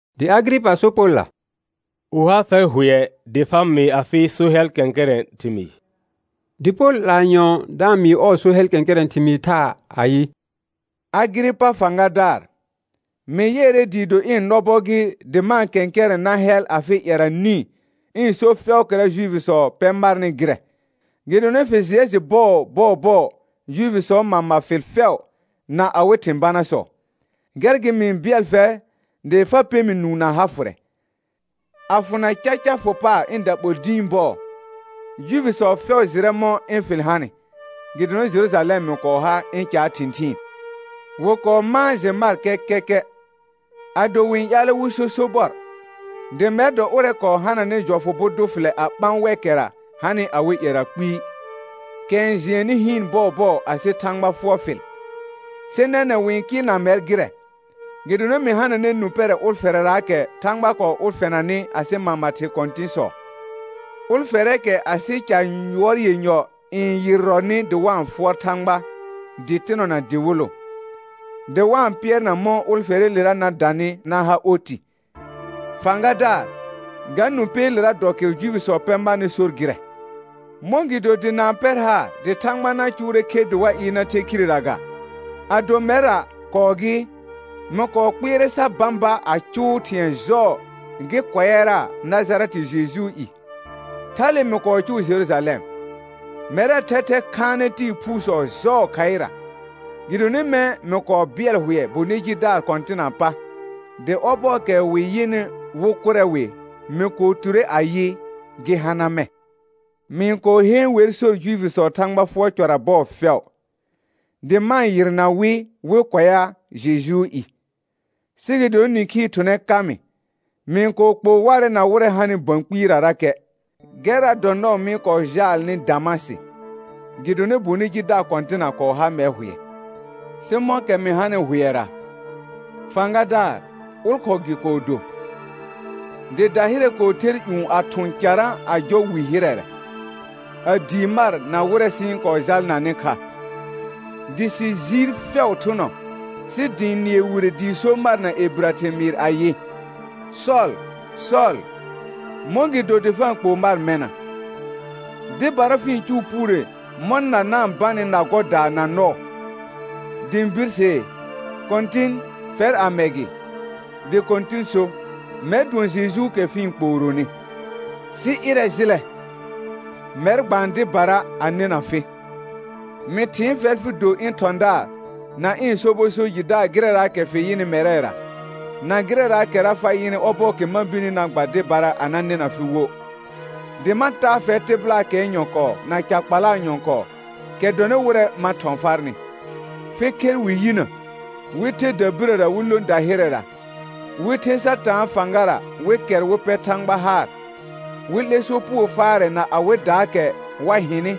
Dɩ Agɩrɩpa so Polla: Wɩ ha fɛr hʋɛ dɩ fa mɩɩ afɩ so hɛl kɛ̃kɛrɛ̃ ɩhɩmɩɩ. Dɩ Pol 'laa nyɔ̃ɔ da-n mɩɩ ɔɔ so hɛl kɛ̃kɛrɛ̃ thɩmɩɩ thaa ayɩ: Agɩrɩpa fãgadaar, mɩ yɩɛrɛ dɩɩ do ɩ̃ nɔbɔ gɩ dɩ ma-n kɛ̃kɛrɛ̃ na hɛl afɩ ƴɛra nĩ ɩ̃ so fɛʋʋkɛra Juifisɔ pɛ marnɩ gɩrɛ, gɩdonɩ fɩ jɩɛ jɩ bɔɔbɔɔbɔɔ Juifisɔɔ mama fɩl fɛʋ na awɩ thɩ̃ banasɔ; gɛr gɩ mɩ-n bɩɛl fɛr dɩ fa pɛ mɩ nũu na ha fʋrɛ. A fʋna caca fʋ paar ɩ̃ daɓol dĩi bɔɔ, Juifisɔ fɛʋ jɩrɛ mɔ̃ ɩ̃ fɩl hanɩ gɩdonɩ Jerũjalɛm mɩ kɔɔ ha ɩ̃ caa thɩ̃thɩɩn. Wɩ kɔɔ mãa jɩ mar kɛkɛkɛ, ado wɩ-n ƴaalɛ wɩ so sobɔr, dɩ mɛr dɔ ʋrɛ kɔɔ hananɩ jɔfʋ bʋ dʋ fɩlɛ a ɓã wɛkɛra hanɩ awɩ ƴɛra kpɩɩ, kɛ n jɩɛnnɩ hɩɩn bɔɔbɔɔ asɩ Thãgba fʋɔr fɩl. Sɩ nɛnɛ̃ wɩ-n kɩɩlna mɛr gɩrɛ, gɩdonɩ mɩ hananɛ nũ pɛrɛ ʋlfɛrɛraakɛ Thãgba kɔɔ ʋlfɛnanɩ asɩ mama thɩ kɔ̃tɩ̃sɔ, ʋlfɛrɛɛkɛ asɩ ca ƴʋɔr yenyɔ n yɩrrɔnɩ dɩ wa-n fʋɔr Thãgba dɩtɩnɔ na dɩwɩlʋ, dɩ wa-n pɩɛrna mɔ̃ ʋlfɛrɛɛlera na danɩ na ha oti. Fãgadaar, ga nũ pɛɛlera dɔ kɩrʋ Juifisɔ pɛ marnɩ sor gɩrɛ. Mɔ̃gɩdo dɩ na-n pɛr haar dɩ Thãgba na cʋʋrɛ khe dɩ wa ɩɩr na the khirera ga? Ado mɛrra kɔɔ gɩ, mɩ kɔɔ kpɩɛrɛ sa bãba a cʋʋ thɩ̃ɛ jɔɔ gɩ kʋɛara Najarɛtɩ Jejuu i. Thale mɩ kɔɔ cʋʋ Jerujalɛm. Mɛrɛɛ thɛthɛ khaanɛ tɩɩ phuusɔ jɔɔ khaɩra, gɩdonɩ mɛ̃ mɩ kɔɔ bɩɛl hʋɛ bonɩ jidaar kɔ̃tɩnaa pa; dɩ ɔbɔɔkɛ wɩ yɩnɩ wɩ kʋrɛ wɩ, mɩ kɔɔ ture ayɩ: Gɩ hana mɛ̃. Mɩ-n kɔɔ heen wer sor Juifisɔɔ Thãgba fʋɔr cɔra bɔɔ fɛʋ, dɩ ma-n yɩrna wɩ wɩ kʋɛa Jejuu i. Sɩ gɩdonɩ nɩ̃khii thʋnɛ ka mɩ, mɩ-n kɔɔ kpoo warɛ na wɩrɛ hanɩ bə̃ kpɩɩrarakɛ. Gɛrra dɔ nɔɔ mɩ-n kɔɔ jaalnɩ Damasɩ, gɩdonɩ bonɩ jidaar kɔ̃tɩna kɔɔ ha mɛr hʋɛ. Sɩ mɔ̃kɛ mɩ hanɩ hʋɛra, fãgadaar, ʋlkhɔɔ gɩ kɔɔ do, dɩ dahɩrɛ kɔɔ ther ƴũ a thʋ̃ carã a jɔ wi hɩrɛrɛ, a dii mar na wɩrɛ sɩ-n kɔɔ jalnanɩ kha. Dɩ sɩ jiir fɛʋ thʋnɔ sɩ dɩ ɩ̃ nɩɛ wire dɩɩ so mar na ebirə thɩmɩɩr ayɩ: Sɔl, Sɔl, mɔ̃gɩdo dɩ fa-n kpoo mar mɛna? Dɩbara fɩ-n cʋʋ puure mɔ̃ na na-n banɩ na gɔdaa na nɔɔ. Dɩ ɩ̃ birsee: Kɔ̃tɩn, fɛr amɛ gɩ? Dɩ Kɔ̃tɩn so: Mɛr dʋɔn Jejuukɛ fɩ-n kpooronɩ. Sɩ ɩrɛ jɩlɛ. Mɛr gbaan dɩbara a nɩna fɩ. Mɩ thɩɩn fɛr fɩ do ɩ̃ thɔ̃daar na ɩ̃ sobɔ so jɩdaar gɩrɛraakɛ fɩ yɩnɩ mɛrɛra, na gɩrɛraakɛra fa yɩnɩ ɔbɔɔkɛ ma birni na gba dɩbara a na nɩna fɩ wo. Dɩ ma taa fɛr tɩbɩlaakɛɛ nyɔ̃kɔɔ na ca kpalaa nyɔ̃kɔɔ kɛ dɔnɩ wɩrɛ ma thɔ̃ farnɩ, fɩ khɛr wɩ yinə, wɩ the dabirəra wɩ lõ dahɩrɛra, wɩ the Satãa fãgara wɩ kɛr wɩ pɛ Thãgba haar, wɩ 'lɛ sopugo faarɛ na awɩdaakɛ wa hɩnɩ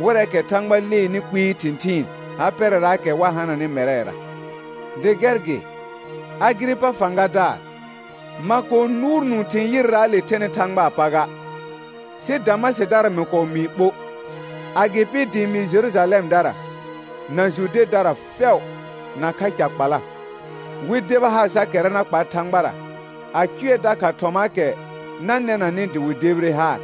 wɩrɛɛkɛ Thãgba leenɩ kpɩɩ thɩ̃thɩɩn ha pɛrɛraakɛ wa hananɩ mɛrɛra. Dɩ gɛr gɩ, Agɩrɩpa fãgadaar, ma kɔɔ nʋʋr nũu thɩ̃ yɩrraale thɛnɩ Thãgbaa pa ga. Sɩ Damasɩdara mɩ kɔɔ mɩɩ ɓo, agɩpɩ dɩ ɩ̃ mɩɩ Jerujalɛmdara na Judedara fɛʋ nakha ca kpala, wɩ deba haar sa kɛra na kpa Thãgbara, a cʋɛ dakha thɔmaakɛ na nɛnanɩ dɩ wɩ debire haar.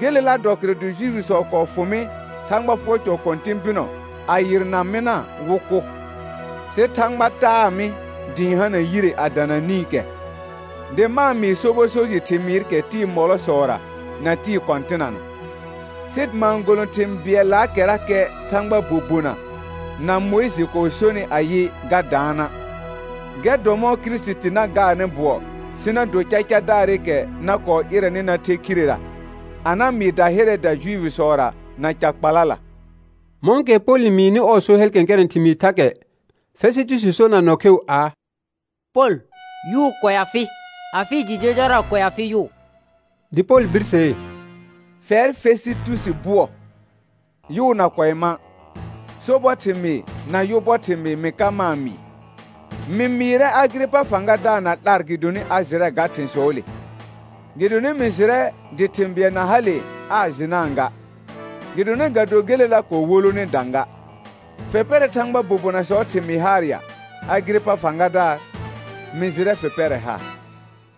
Gelela dɔ kɩrʋ dɩ Juifisɔ kɔɔ fʋ mɩ Thãgba fʋɔr cɔ kɔ̃tɩ̃ bɩnɔ a yɩrna mɩna wɩ kʋ. Sɩ Thãgba taa mɩ dɩ ɩ̃ hana yire a dana nĩkɛ, dɩ ma-n mɩɩ sobɔ so jɩ thɩmɩɩrɩkɛ tɩɩ mɔlɔsɔra na tɩɩ kɔ̃tɩnana, sɩ ma-n golõ thɩ̃ bɩɛllaakɛrakɛ Thãgbaa bobona na Mʋɩjɩ kɔɔ sonɩ ayɩ ga daana'; gɛr dɔ mɔ̃ Kirisiti na gaarnɩ bʋɔ sɩ na do cacadaarɩkɛ na kɔɔ ɩrɛnɩ na the khirera a na mɩɩ dahɩrɛɛda Juifisɔra na ca kpalala. Mɔ̃kɛ Pol n mɩɩnɩ ɔɔ so hɛl kɛ̃kɛrɛ̃ thɩmɩɩ thakɛ, Fɛsɩtusi sor na nɔ kheu aa: Pol, yʋʋ kʋɛa fɩ, afɩ jɩ jɔjɔra kʋɛa fɩ yʋʋ. Dɩ Pol birsee: Fɛr, Fɛsɩtusi bʋɔ, yʋʋ na kʋɛ ma', sobɔ thɩmɩɩr na yʋ bɔ thɩmɩɩr mɩ ka ma-n mɩɩ. Mɩ mɩɩrɛ Agɩrɩpa fãgadaar na 'lar gɩdonɩ a jɩrɛ ga thɩ̃sɔɔle; gɩdonɩ mɩ jɩrɛ dɩ thɩ̃ bɩɛl na hale aa jɩnaa ga, gɩdonɩ ga do gelela kɔɔ wolone dã ga. Fɩ pɛrɛ Thãgbaa bobonasɔɔ thɩmɩɩ haar ya, Agɩrɩpa fãgadaar? Mɩ jɩrɛ fɩ pɛrɛ haar.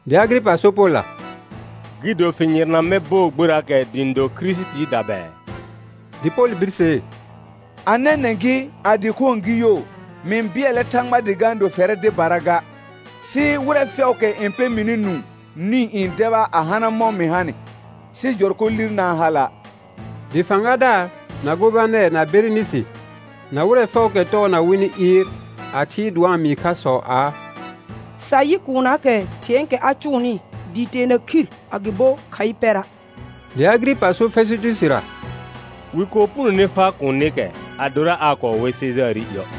Dɩ Agɩrɩpa so Polla: Gɩ do fɩ yɩrna mɛr bɔɔ gberaakɛ dɩ ɩ̃ do Kirisitiida bɛɛ? Dɩ Pol birsee: A nɛnɛ̃ gɩ, a dɩkhõo gɩ yoo, mɩ-n bɩɛlɛ Thãgba dɩ ga-n do fɛrɛ dɩbara ga, sɩ wɩrɛ fɛʋʋkɛ n pɛ mɩnɩ nũu nĩ n deba a hana mɔ mɩ hanɩ, sɩ jɔrkɔ lir na-n hala'. Dɩ fãgadaar, na gobanɛr, na Berenɩsɩ, na wɩrɛ fɛʋʋkɛ tɔɔna wɩnɩ ɩɩr a thɩɩr dɩ wa-n mɩɩ khasɔ aa: Sa yɩ kuunnaakɛ thɩ̃ɛɛkɛ a cʋʋnɩ dɩɩ teena khir agɩbo khaɩ pɛra'. Dɩ Agɩrɩpa so Fɛsɩtusira: Wɩ kɔɔ punone faa kuunikɛ adora aa kɔɔ we Sejaarɩ iə'.